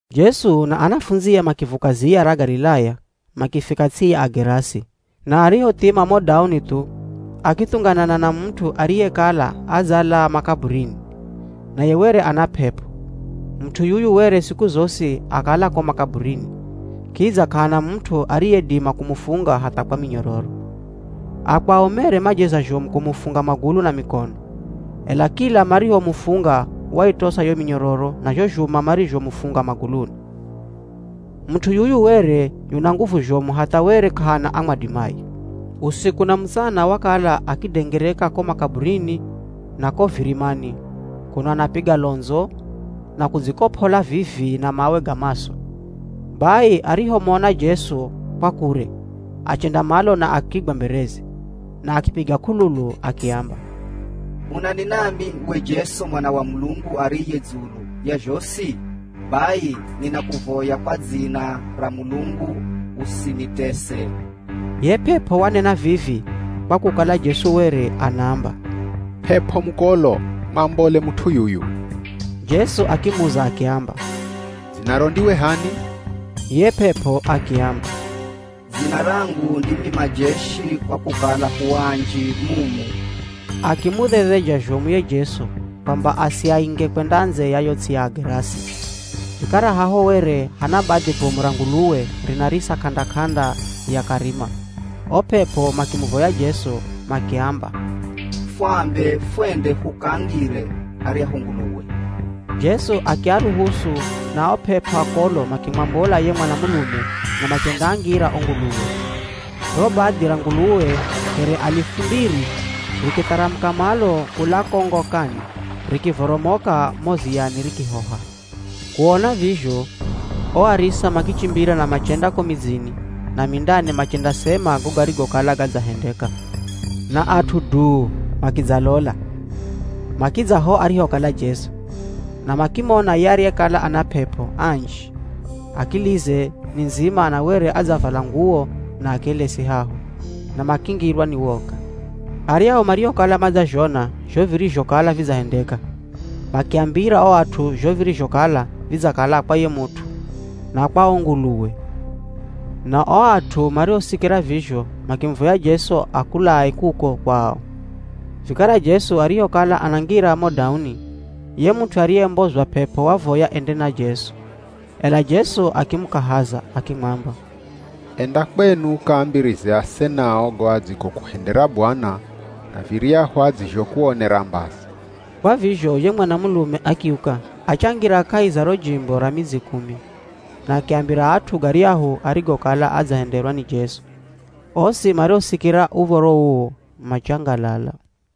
Jesu na anafundzie makivuka ziya ra Galilaya makifika ts'i ya Agerasi. Na arihothima mo dauni thu akithunganana na mut'u ariyekala adzalaa makaburini, naye were ana p'ep'o. Mut'u yuyu were siku zosi akala ko makaburini, kidza k'ahana mut'u ariyedima kumufunga hatha kwa minyororo. Akwao mere majeza zhomu kumufunga magulu na mikono, ela kila marihomufunga waitosa yo minyororo na zho zhuma marizhomufunga maguluni. Mut'u yuyu were yuna nguvu zhomu hatha were k'ahana amwadimaye. Usiku na mutsana wakala akidengereka ko makaburini na ko virimani kuno anapiga londzo na kudzikop'ola vii-vii na mawe ga maso. Bai arihomona Jesu kwa kure, achenda malo na akigwa mbereze, na akipiga k'ululu akiamba, “Unani nami we Jesu Mwana wa Mulungu ariye dzulu ya zhosi? Bai ninakuvoya kwa dzina ra Mulungu usinitese!” Ye p'ep'o wanena vivi kwa kukala Jesu were anaamba, “P'ep'o mukolo mwambole mut'u yuyu!” Jesu akimuza akiamba, “Dzinaro ndiwe h'ani?” Ye p'ep'o akiamba, “Dzina rangu ndimi majeshi kwa kukala hu anji mumu!” Akimudhedheja zhomu ye Jesu kwamba asiainge kwenda ndze ya yo ts'i ya Agerasi. Vikara haho were hana badhi bomu ra nguluwe rinarisa k'anda-k'anda ya karima. O p'ep'o makimuvoya Jesu makiamba, “Fwambe fwende hukaangire aryahu nguluwe.” Jesu akiaruhusu na o p'ep'o akolo makimwambola ye mwanamulume na machendaangira o nguluwe. Ro badhi ra nguluwe here alifu mbiri rikitharamuka malo kula ko ngokani rikivoromoka mo ziyani rikihoha. Kuona vizho, o arisa makichimbira na machenda ko midzini na mindani machendasema go garigokala gadzahendeka. Na at'u duu makidzalola. Makidza ho arihokala Jesu, na makimona ye ariyekala ana p'ep'o anji akilize ni ndzima na were adzavala nguwo na akelesi haho, na makingirwa ni woga. Aryahu mariokala madzazhona zho virizhokala vidzahendeka, makiambira o at'u zho virizhokala vidzakala kwa ye mut'u na kwa o nguluwe. Na o at'u marihosikira vizho makimuvoya Jesu akulae kuko kwao. Vikara Jesu arihokala anangira mo dauni, ye mut'u ariyembozwa p'ep'o wavoya ende na Jesu. Ela Jesu akimukahaza, akimwamba, “Enda kwenu ukaambirize asenao go adzigokuhendera Bwana, na viryahu adzizhokuonera mbazi.” Kwa vizho ye mwanamulume akiuka, achangira kahi za ro jimbo ra Midzi Kumi, na akiambira at'u garyahu arigokala adzahenderwa ni Jesu. Osi mariosikira uv̱oro uu machangalala.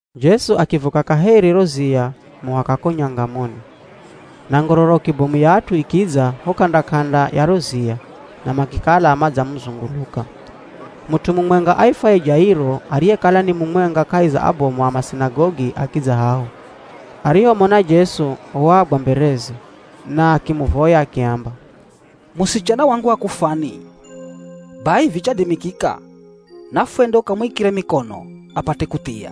Jesu akivuka kaheri ro ziya muhaka ko nyangamoni. Na ngororoki bomu ya at'u ikidza ho k'anda-k'anda ya ro ziya na makikala madzamuzunguluka. Mut'u mumwenga aifwaye Jairo ariyekala ni mumwenga kahi za abomu a masinagogi akidza haho. Arihomona Jesu wagwa mbereze, na akimuvoya akiamba, “Musichana wangu akufwani. Bai vichadimikika nafwende ukamwikire mikono apate kuthia.”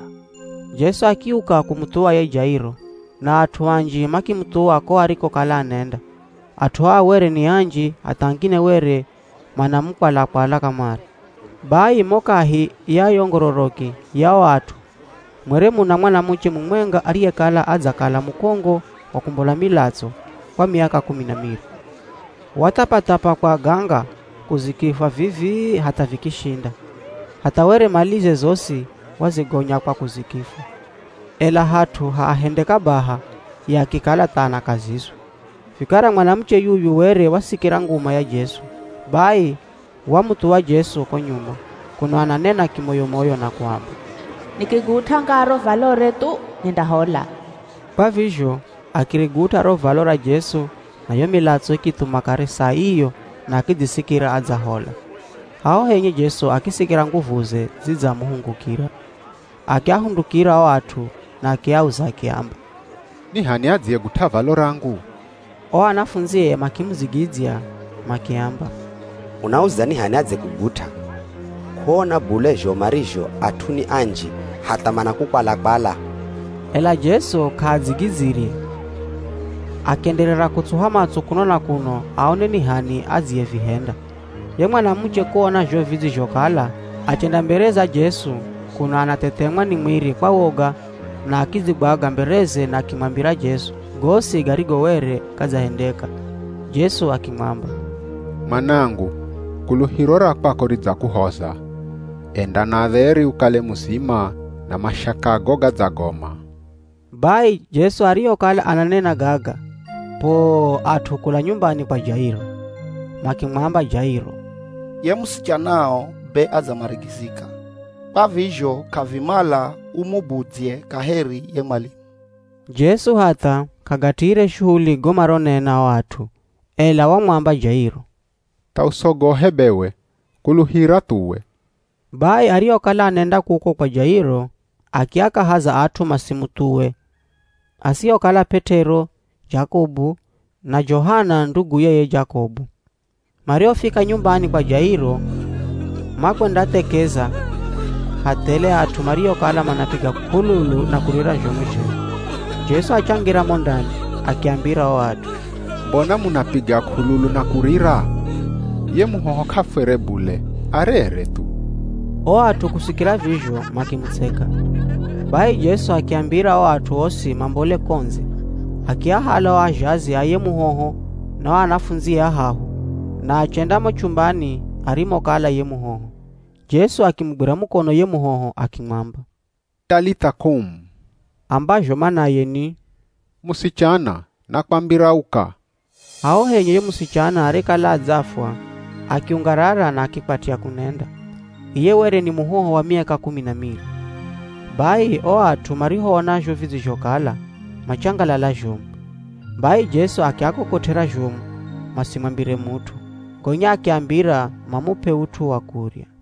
Jesu akiuka kumuthuwa ye Jairo, na at'u anji makimuthuwa ko arikokala anenda. At'u aa were ni anji hatha angine were manamukwala-kwala kamare. Bai mo kahi ya yo ngororoki ya o at'u mwere muna mwanamuche mumwenga ariyekala adzakala mukongo wa kumbola milatso, kwa miaka kumi na miri. Wathapathapa kwa aganga kuzikifwa vivii hatha vikishinda. Hatha were malize zosi wazigonya kwa kuzikifwa, ela hat'u ha ahende kabaha, ye akikala tha anakazizwa. Vikara mwanamuche yuyu were wasikira nguma ya Jesu, bai wamuthuwa Jesu ko nyuma, kuno ananena kimoyo-moyo na kuamba, “Nikigut'a ngaa ro valore thu, nindahola.” Kwa vizho akirigut'a ro valo ra Jesu na yo milatso ikithuma kare saa iyo na akidzisikira adzahola. Haho henye Jesu akisikira nguvuze zidzamuhungukira. Akiahundukira o at'u na akiauza akiamba, “Ni h'ani adziyegut'a valo rangu?” O anafundzie makimudzigidzya makiamba, “Unauza ni h'ani adzekugut'a, k'uona bule zho marizho at'u ni anji hatha manakukwala-kwala?” Ela Jesu k'aadzigidzire akienderera kutsuha matso kuno na kuno aone ni h'ani adzevihenda. Ye mwanamuche kuona zho vidzizhokala achenda mbere za Jesu kuno anathethemwa ni mwiri kwa woga na akidzigwaga mbereze na akimwambira Jesu gosi garigo were gadzahendeka. Jesu akimwamba, “Mwanangu kuluhiro ra kwako ridzakuhoza. Enda na dheri ukale muzima na mashakago gadzagoma.” Bai Jesu arihokala ananena gaga, poo at'u kula nyumbani kwa Jairo, makimwamba Jairo, “Ye musichanao be adzamarigizika, kwa vizho k'avimala umubudzye kaheri ye mwalimu.” Jesu hatha k'agatiire shuhuli go maronena o at'u, ela wamwamba Jairo, “Tha usogohe bewe, kuluhira thuwe.” Bai arihokala anenda kuko kwa Jairo, akiakahaza at'u masimuthuwe asihokala P'et'ero, Jakobu na Johana nduguye ye Jakobu. Marihofika nyumbani kwa Jairo, makwendathekeza ha thele at'u mariokala manapiga k'ululu na kurira zhomu zhenye. Jesu achangira mo ndani, akiambira o at'u, “Mbona munapiga k'ululu na kurira? Ye muhoho k'afwere bule, arere thu.” O at'u kusikira vizho makimutseka. Bai Jesu akiambira o at'u osi mambole ko ndze, akiahala o azhazi a ye muhoho na o anafundzie ahahu na achenda mo chumbani arimokala ye muhoho. Jesu akimugwira mukono ye muhoho akimwamba, “Talitha Koum.” Ambazho manaye ni, “Musichana, nakwambira uka!” Haho henye ye musichana arekala adzafwa akiungarara na akikwatya kunenda (iye were ni muhoho wa miaka kumi na miri). Bai o at'u marihoona zho vidzizhokala, machangalala zhomu. Bai Jesu akiakokot'era zhomu, masimwambire mut'u. Gonya akiambira mamup'e ut'u wa kurya.